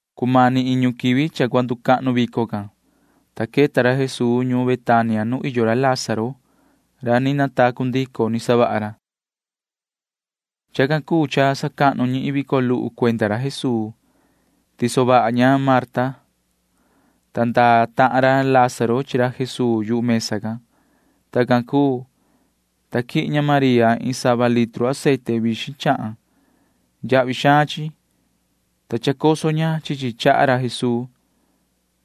Cumani iñu quivi cha cua nducahnu vico can, ta queta ra Jesuu ñuun Betania nu iyo ra Lázaro ra ni natacu ndico ni savaha ra Jesuu. Chacan cuu cha sacahnu ñi iin vico luhu cuenda ra Jesuu. Tiso vaha ña Marta, ta iyo tahan ra Lázaro chi ra Jesuu mesa can. Tacan cuu, ta quihin ña María iin sava litru aceite vixin chahan. Yahvi xaan chi, ta choso ña chi chi chaha ra Jesuu,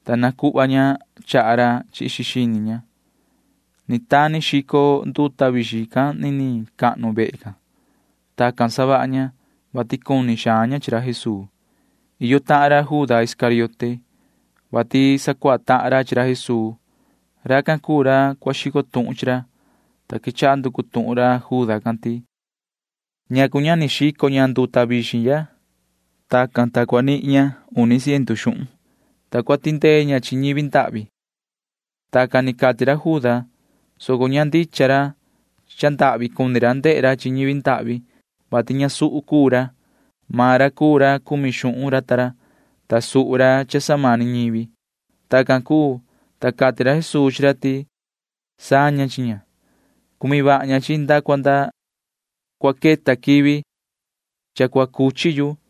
ta nacuhva ña chaha ra chi xini ña. Ni tani xico nduta vixin can niniin vehe. [Tacan savaha ña, vati cuni xaan ña chi ra Jesuu.] Iyo tahan ra Juda Iscariote, vati sacuaha tahan ra chi ra Jesuu. Racan cuu ra cua xico tuhun chi ra, ta quechaha nducu tuhun ra Juda can ti: ―¿Ñacu ña ni xico ña nduta vixin ya? Tacan, ta nihin ña uni ciendu xuhun, ta cua tindee ña chi ñivi ndahvi. Tacan ni cati ra Juda, soco ña tichaha ni ra yoso cuhva iyo ñivi ndahvi can, vati ñasuhu cuu ra. Maan ra cuu ra cumi xuhun ra ta ra, ta suhu ra cha samani ñivi. Tacan cuu, ta cati ra Jesuu chi ra ti: ―Saña chi ña. Na cua cumi ña chi chi nda cua nda quivi cua cuchi yu,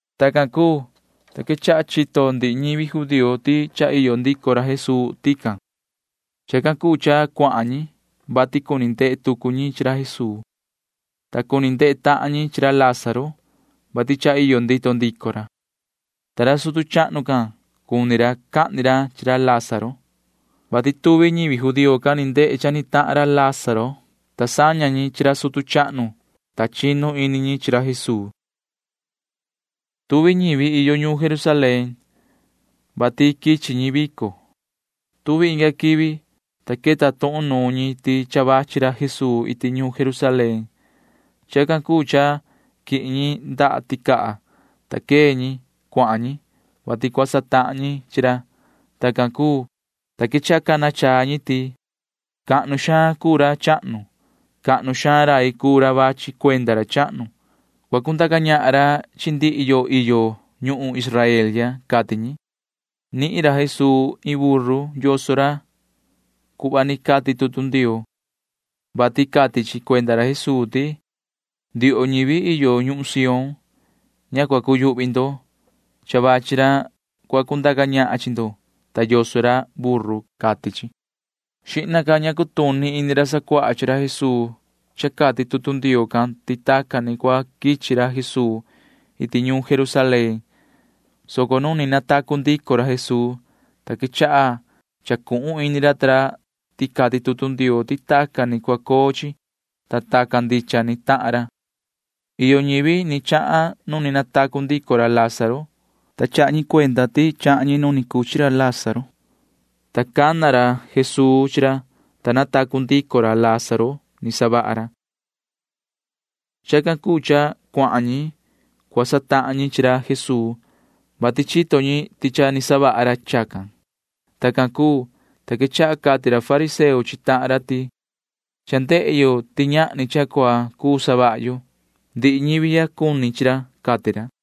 Tacan cuu, ta quechaha chito ndihi ñivi judío ti cha iyo ndico ra Jesuu tican. Chacan cuu cha cuahan ñi, vati cuni ndehe tucu ñi chi ra Jesuu, ta cuni ndehe tahan ñi chi ra Lázaro, vati cha iyo ndito ndico ra. Ta ra sutu chahnu can―cuni ra cahni ra chi ra Lázaro, vati tuvi ñivi judío can ni ndehe cha ni tahan ra Lázaro can, ta saña ñi chi ra sutu chahnu, ta chinu ini ñi chi ra Jesuu. Tuvi ñivi cuu ñi cha iyo ñuun Jerusalén, vati quichi ñi vico. Tuvi inga quivi, ta queta tuhun nuun ñi ti cha vachi ra Jesuu iti ñuun Jerusalén. Chacan cuu cha quihin ñi ndaha ticaha, ta quee ñi. Cuahan ñi, vati cua satahan ñi chi ra. Tacan cuu, ta quechaha cana chaa ñi ti: ―¡Cahnu xaan cuu ra chahnu! ¡Cahnu xaan rai cuu ra vachi cuenda ra chahnu! ¡Cua cundaca ñahan ra chi ndihi yo iyo ñuhun Israel ya! ―cati ñi. Nihin ra Jesuu iin buru yoso ra cuhva ni cati tutu Ndioo, vati cati chi cuenda ra Jesuu ti: Ndioho ñivi iyo ñuhun Sión―ña cua cuyuhvi ndo. Cha vachi ra cua cundaca ñahan chi ndo, ta yoso ra buru, cati chi. Xihna ña cutuni ini ra sacuaha chi ra Jesuu cha cati tutu Ndioo can ti tacan ni cua quichi ra Jesuu iti ñuun Jerusalén, soco nu ni natacu ndico ra Jesuu, ta quechaha chacuhun ini ra ta ra ti cati tutu Ndioo ti tacan ni cua coo chi, ta tacan ndicha ni tahan ra. Iyo ñivi ni chahan nu ni natacu ndico ra Lázaro, ta chaha ñi cuenda ti chahan ñi nu ni cuchi ra Lázaro, ta cana ra Jesuu chi ra, ta natacu ndico ra Lázaro ni savaha ra. Chacan cuu cha cuahan ñi cua satahan ñi chi ra Jesuu, vati chito ñi ti cha ni savaha ra chacan. Tacan cuu, ta quechaha cati ra fariseo chi tahan ra ti: ―Cha ndehe yo ti ñahni cha cua cuu savaha yo. Ndihi ñivi ya cuni chi ra ―cati ra.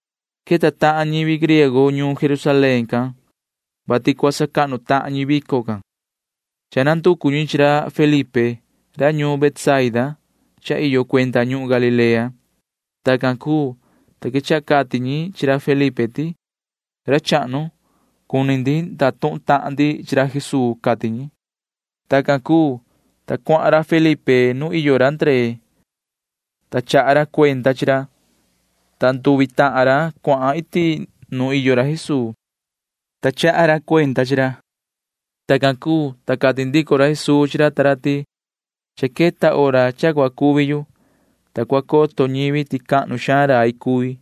Iyo tahan ñivi griego ni queta ñuun Jerusalén can, vati cua sacahnu tahan ñi vico can. Cha nanducu ñi chi ra Felipe, ta maan ra cuu ra quichi ñuun Betsaida iyo cuenda ñuhun Galilea. Tacan cuu, ta quechaha cati ñi chi ra Felipe ti: ―Ra chahnu, cuni ndatuhun tahan ndi chi ra Jesuu ―cati ñi. Tacan cuu, ta cuahan ra Felipe nuun iyo ra Ndree, ta chaha ra cuenda chi ra, ta nduvi tahan ra cuahan iti nuun iyo ra Jesuu, ta chaha ra cuenda chi ra. Tacan cuu, ta cati ndico ra Jesuu chi ra ta ra ti: ―Cha queta hora cha cua cuvi yu, ta cua coto ñivi ti cahnu xaan rai cui.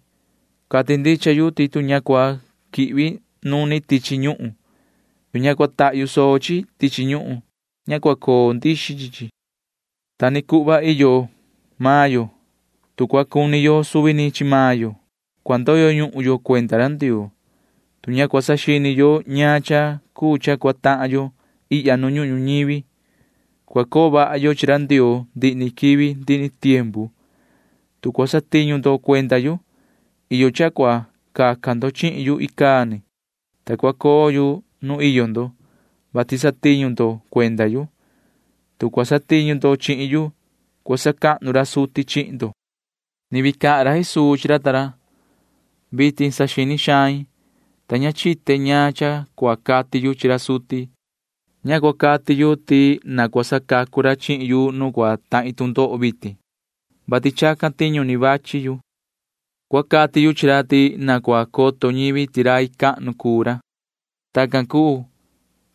Cati ndicha yu ti tu ña cua quihvi nuni tichi ñuhun, tu ña cua tahyu soo chi tichi ñuhun, ña cua coo ndixi chi chi. Ta ni cuhva iyo maan yo. Tu cua cuni yo suvi ni chi maan yo, cua ndoyo ñuhun yo cuenda ra Ndioo. Tu ña cua saxini yo ñaan cha cuu cha cua tahan yo ihya nu ñuhun ñuñivi, cua coo vaha yo chi ra Ndioo ndihi ni quivi ndihi ni tiempu. Tu cua satiñu ndo cuenda yu, iyo cha cua caca ndo chihin yu icaa ni, ta cua coo yu nu iyo ndo, vati satiñu ndo cuenda yu. Tu cua satiñu ndo chihin yu, cua sacahnu ra suti chihin ndo. [Ni vii cahan ra Jesuu chi ra ta ra:] ’Vitin saxini xain, ta ña chite ñaan cha cua cati yu chi ra suti. Ña cua cati yu ti na cua sacacu ra chihin yu nu cua tahin tu ndoho vitin, vati chacan tiñu ni quichi yu. Cua cati yu chi ra ti na cua coto ñivi ti rai cahnu cuu ra. Tacan cuu,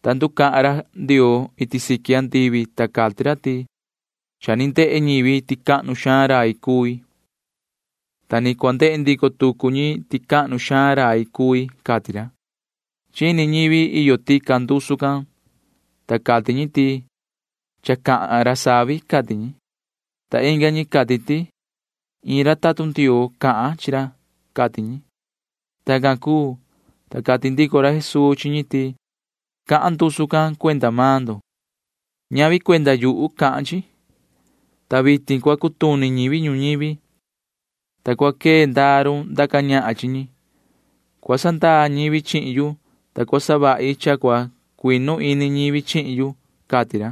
ta nducahan ra Ndioo iti siqui andivi, ta cati ra ti: ―Cha ni ndehe ñivi ti cahnu xaan rai cui, ta ni cua ndehe ndico tucu ñi ti cahnu xaan rai cui ―cati ra. Chini ñivi iyo tican ndusu can, ta cati ñi ti: ―Cha cahan ra savi ―cati ñi. Ta inga ñi cati ti: ―Cha cahan iin ra tatun Ndioo chi ra ―cati ñi. Tacan cuu, ta cati ndico ra Jesuu chi ñi ti: ―Cahan ndusu can cuenda maan ndo. Ñavi cuenda yuhu cahan chi, ta vitin cua cutuni ñivi ñuñivi, ta cua quee ndaa run ndaca ñahan chi ñi. Cua sandaa ñivi chihin yu, ta cua savahi cha cua cuinu ini ñivi chihin yu ―cati ra.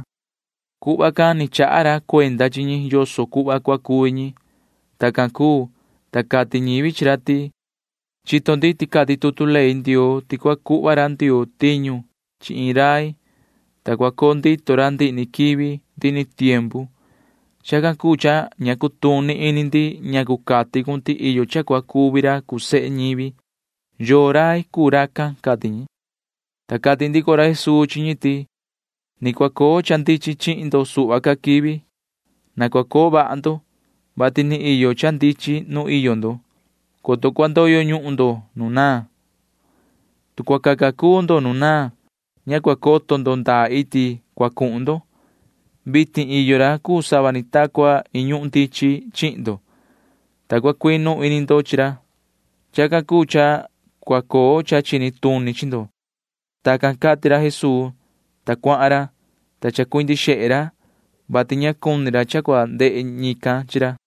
Cuhva can ni chaha ra cuenda chi ñi yoso cuhva cua cuvi ra. Tacan cuu, ta cati ñivi chi ra ti: ―Chito ndi ti cati tutu ley Ndioo ti cua cuhva ra Ndioo tiñu chi iin rai, ta cua coo ndito ra ndihi ni quivi ndihi ni tiempu. Chacan cuu cha ña cutuni ini ndi ñacu cati cun ti iyo cha cua cuvi ra cuu sehe ñivi. ¿Yoo rai cuu racan? ―cati ñi. Ta cati ndico ra Jesuu chi ñi ti: ―Ni cua coo cha ndichin chihin ndo suhva ca quivi. Na cua coo vaha ndo, vati ni iyo cha ndichin nu iyo ndo, coto cua ndoyo ñuhun ndo nu naan. Tu cua caca cuu ndo nu naan, ña cua coto ndo ndaa iti cuahan ndo. Vitin iyo ra cuu sava ni ta cua iin ñuhun ndichin chihin ndo, ta cua cuinu ini ndo chi ra. Chacan cuu cha cua coo cha chini tuni chi ndo. Tacan cati ra Jesuu, ta cuahan ra, ta chacuindi xehe ra, [vati ña cuni ra cha cua ndehe ñican chi ra].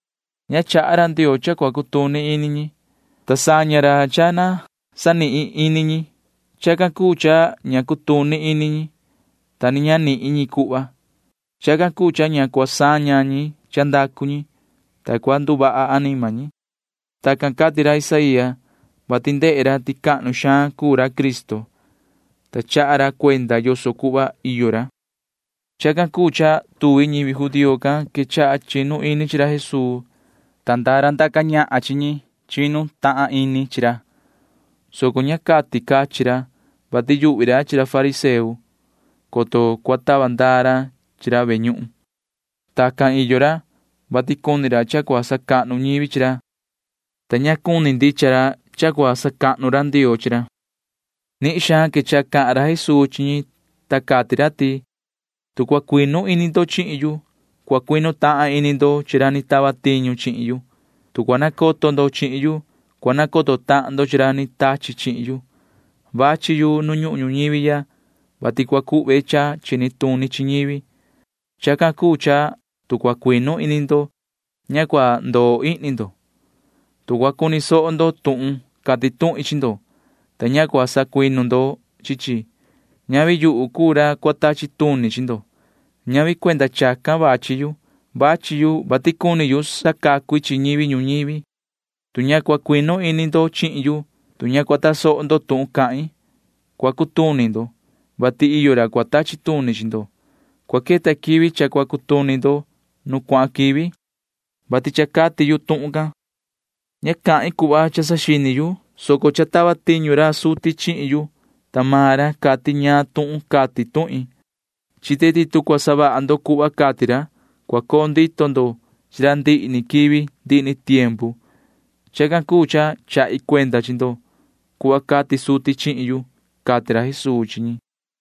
Ña chaha ra Ndioo cha cua cutuni ini ñi, ta saña ra cha na sanihin ini ñi. Chacan cuu cha ña cutuni ini ñi, ta ni ña nihin ñi cuhva. Chacan cuu cha ña cua saña ñi cha ndacu ñi, ta cua nduvaha anima ñi. Tacan cati ra Isaía, vati ndehe ra ti cahnu xaan cuu ra Cristo, ta chaha ra cuenda yoso cuhva iyo ra. Chacan cuu cha tuvi ñivi judío can quechaha chinu ini chi ra Jesuu, ta iyo tahan ra ndaca ñahan chi ñi, ta chinu tahan ini ra, soco ña cati cachin ra, vati yuhvi ra chi ra fariseo, coto cua tava ndaa ra chi ra ve ñuhun. Tacan iyo ra, vati cuni ra cha cua sacahnu ñivi chi ra, ta ña cuni ndicha ra cha cua sacahnu ra Ndioo chi ra. Nihin xaan quechaha cahan ra Jesuu chi ñi, ta cati ra ti: ―Tu cua cuinu ini ndo chihin yu, cua cuinu tahan ini ndo chi ra ni tava tiñu chihin yu. Tu cua nacoto ndo chihin yu, cua nacoto tahan ndo chi ra ni tachi chihin yu. Cha quichi yu ihya nu ñuhun ñuñivi ya, vati cua cuhve cha chini tuni chi ñivi. Chacan cuu cha tu cua cuinu ini ndo, ña cua ndoo ihni ndo. Tu cua cuni soho ndo tuhun cati tuhin chi ndo, ta ña cua sacuinu ndo chi chi, ñavi yuhu cuu ra cua tachi tuni chi ndo. Ñavi cuenda chacan ni quichi yu vitin, soco quichi yu, vati cuni yu sacacu i chi ñivi ñuñivi. Tu ña cua cuinu ini ndo chihin yu, tu ña cua tasoho ndo tuhun cahin, cua cutuni ndo, vati iyo ra cua tachi tuni chi ndo. Cua queta quivi cha cua cutuni ndo nu cuahan quivi, vati cha cati yu tuhun can. Ña cahin cuhva cha saxini yu, soco cha tava tiñu ra suti chihin yu, ta maan ra cati ñaan tuhun cati tuhin. Chite ti tu cua savaha ndo cuhva cati ra, cua coo ndito ndo chi ra ndihi ni quivi ndihi ni tiempu. Chacan cuu cha chahi cuenda chi ndo cuhva cati suti chihin yu ―cati ra Jesuu chi ñi.